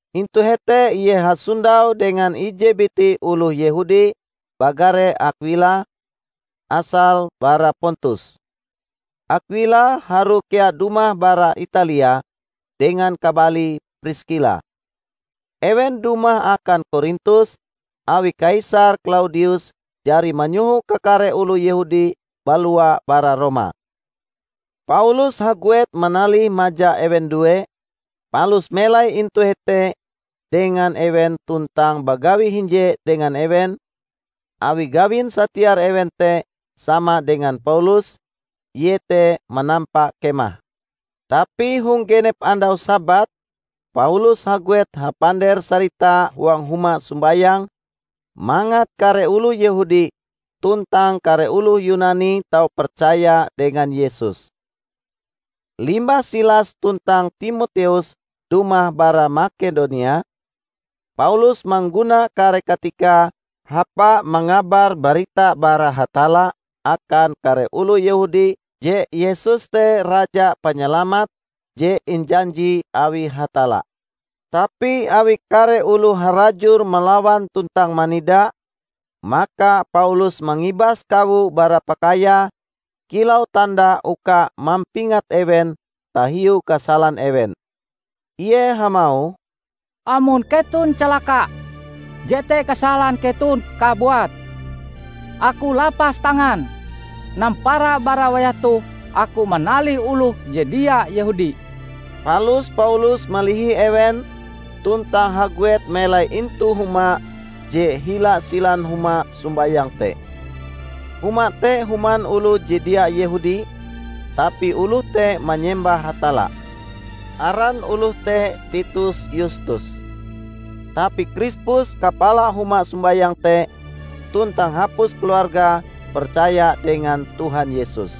Intu hete ie hasondau dengan ije biti oloh Yehudi bagare Akwila, asale bara Pontus. Akwila harue kea dumah bara Italia dengan kabalie Priskila. Ewen dumah akan Korintus awi Kaisar Klaudius jari manyoho kakare oloh Yehudi balua bara Roma. Paulus haguet manalih maja ewen due, palus melai intu hete dengan ewen tuntang bagawi hinje dengan ewen, awi gawin satiar ewen te sama dengan Paulus, iete manampa kemah. Tapi hong genep andau Sabat Paulus haguet hapander-sarita huang huma sombayang mangat kare oloh Yehudi tuntang kare oloh Yunani tau percaya dengan Yesus. Limbah Silas tuntang Timoteus dumah bara Makedonia, Paulus mangguna kare katikae hapa mangabar barita bara Hatalla akan kare oloh Yehudi je Yesus te Raja Panyalamat je injanji awi Hatalla. Tapi awi kare oloh harajur malawan tuntang manida, maka Paulus mangibas kawo bara pakaiae kilau tanda uka mampingat ewen tahiu kasalan ewen. Ie hamauh, "Amon keton calaka, jete kasalan keton kabuat! Aku lapas tangan! Nampara bara wayah toh aku manalih oloh je dia Yehudi." Palus Paulus malihi ewen tuntang haguet melai intu huma je hila silan huma sombayang te. Huma te human oloh je dia Yehudi, tapi oloh te manyembah Hatalla. Aran oloh te Titus Yustus. Tapi Krispus kapala huma sombayang te tuntang hapus keluargae percaya dengan Tuhan Yesus.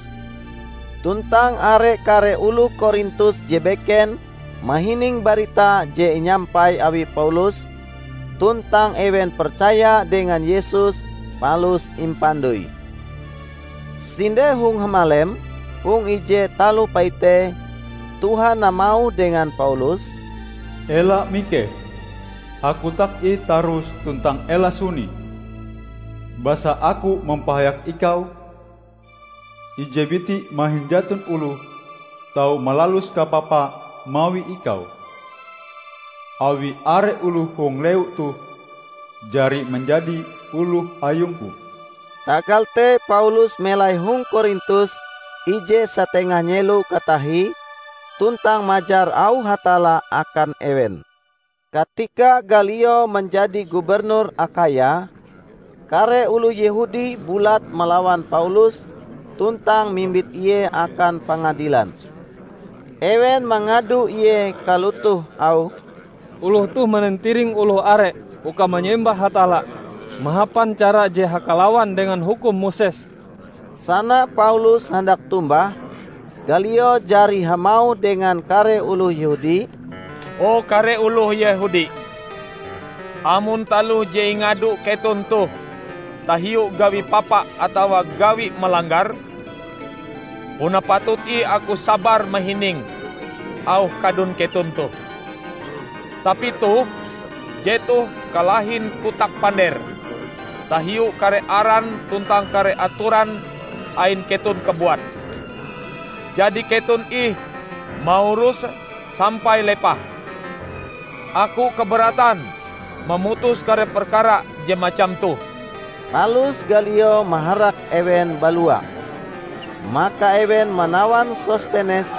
Tuntang are kare oloh Korintus je beken mahining barita je inyampai awi Paulus, tuntang ewen percaya dengan Yesus palus impandoi. Sinde hong hamalem, hong ije taloh paite, Tuhan hamauh dengan Paulus, "Ela mikeh! Hakotak ih tarus tuntang ela suni. Basa Aku mampahayak ikau. Ije biti mahin jaton oloh tau malalus kapapa mawi ikau, awi are oloh hong lewu toh jari manjadi oloh Ayung-Ku." Tagal te Paulus melai hong Korintus ije satengah nyelo katahie tuntang majar auh Hatalla akan ewen. Katika Galio manjadi gubernur Akhaya, kare oloh Yehudi bulat malawan Paulus tuntang mimbit ie akan pangadilan. Ewen mangado ie kalotoh auhe, "Oloh toh manantiring oloh are uka manyembah Hatalla mahapan cara je hakalawan dengan hukum Moses!" Sana Paulus handak tombah, Galio jari hamauh dengan kare oloh Yehudi, "O kare oloh Yehudi! Amon taloh je ingado keton toh tahiu gawi papa atawa gawi malanggar, puna patut ih aku sabar mahining auh kadun keton toh. Tapi toh, jetoh kalahin kotak pander tahiu kare aran tuntang kare atoran ain keton kabuat! Jadi keton ih mauruse sampai lepah. Aku kaberatan mamutus kare perkara je macam toh!" Palus Galio maharak ewen balua. Maka ewen manawan Sostenes,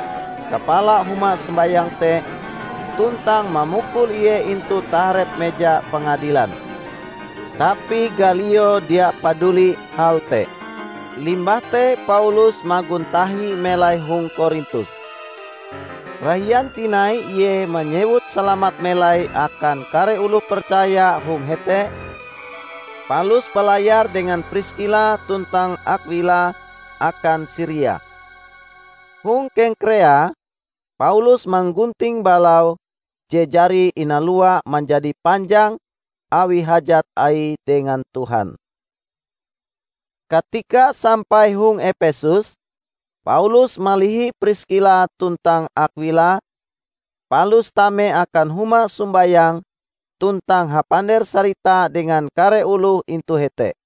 kapala huma sombayang te, tuntang mamukul ie intu taharep meja pangadilan. Tapi Galio dia paduli hal te. Limbah te Paulus magon tahi melai hong Korintus. Rahian tinai ie manyewut salamat melai akan kare oloh percaya hong hete, palus balayar dengan Priskila tuntang Akwila akan Siria. Hong Kengkrea, Paulus manggunting balaue je jari inaluae manjadi panjang awi hajat aie dengan Tuhan. Katika sampai hong Epesus, Paulus malihi Priskila tuntang Akwila, palus tame akan huma sombayang tuntang hapander-sarita dengan kare oloh intu hete.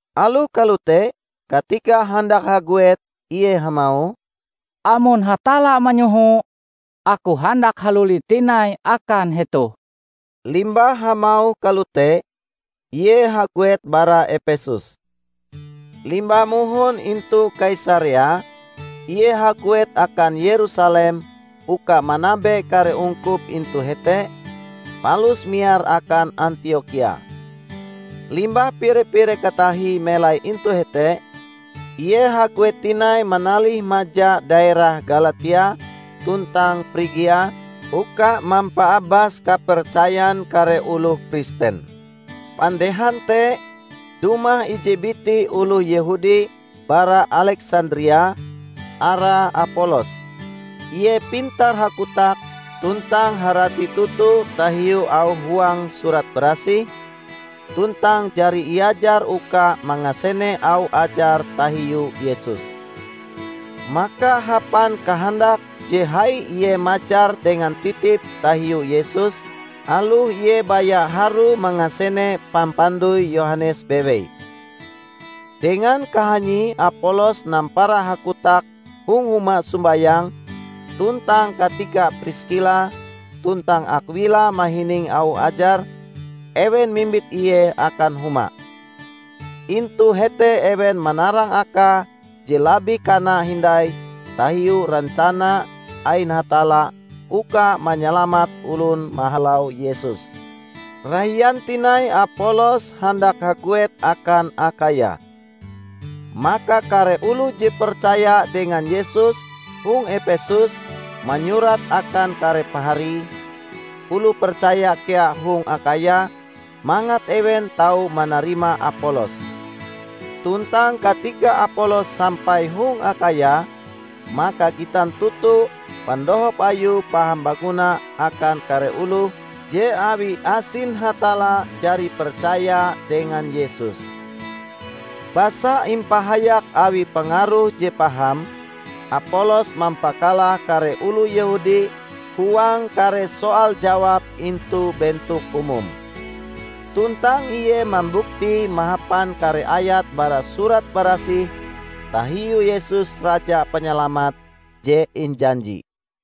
Aloh kalote, katika handak haguet, ie hamauh, "Amon Hatalla manyoho, aku handak haluli tinai akan hetoh." Limbah hamauh kalote, ie haguet bara Epesus. Limbah mohon intu Kaisarea, ie haguet akan Yerusalem uka manabe kare ungkup intu hete, palus miar akan Antiokhia. Limbah pire-pire katahie melai intu hete, ie haguet tinai manalih maja daerah Galatia tuntang Prigia uka mampaabas kapercayan kare oloh Kristen. Pandehan te, dumah ije biti oloh Yehudi bara Aleksandria, arae Apolos. Ie pintar hakotak tuntang harati toto tahiu auh huang Surat Barasih, tuntang jari iajar uka mangasene auh ajar tahiu Yesus. Maka hapan kahandak je hai ie majar dengan titip tahiu Yesus, aloh ie baya harue mangasene pampandoi Yohanes bewei. Dengan kahanyie Apolos nampara hakotak hong huma sombayang tuntang katika Priskila tuntang Akwila mahining auh ajare, ewen mimbit ie akan huma. Intu hete ewen manarang akae je labih kana hindai tahiu rencana ain Hatalla uka manyalamat olon mahalau Yesus. Rahian tinai Apolos handak haguet akan Akhaya. Maka kare oloh je percaya dengan Yesus hong Epesus manyurat akan kare pahari, oloh percaya kea hong Akhaya mangat ewen tau manarima Apolos. Tuntang katika Apolos sampai hong Akhaya, maka gitan toto pandohop ayue paham baguna akan kare oloh je awi asin Hatalla jari percaya dengan Yesus. Basa impahayak awi pangaruhe je paham, Apolos mampakalah kare oloh Yehudi huang kare soal-jawab intu bentok umum. Tuntang ie mambuktie mahapan kare ayat bara Surat Barasih tahiu Yesus Raja Panyalamat je injanji.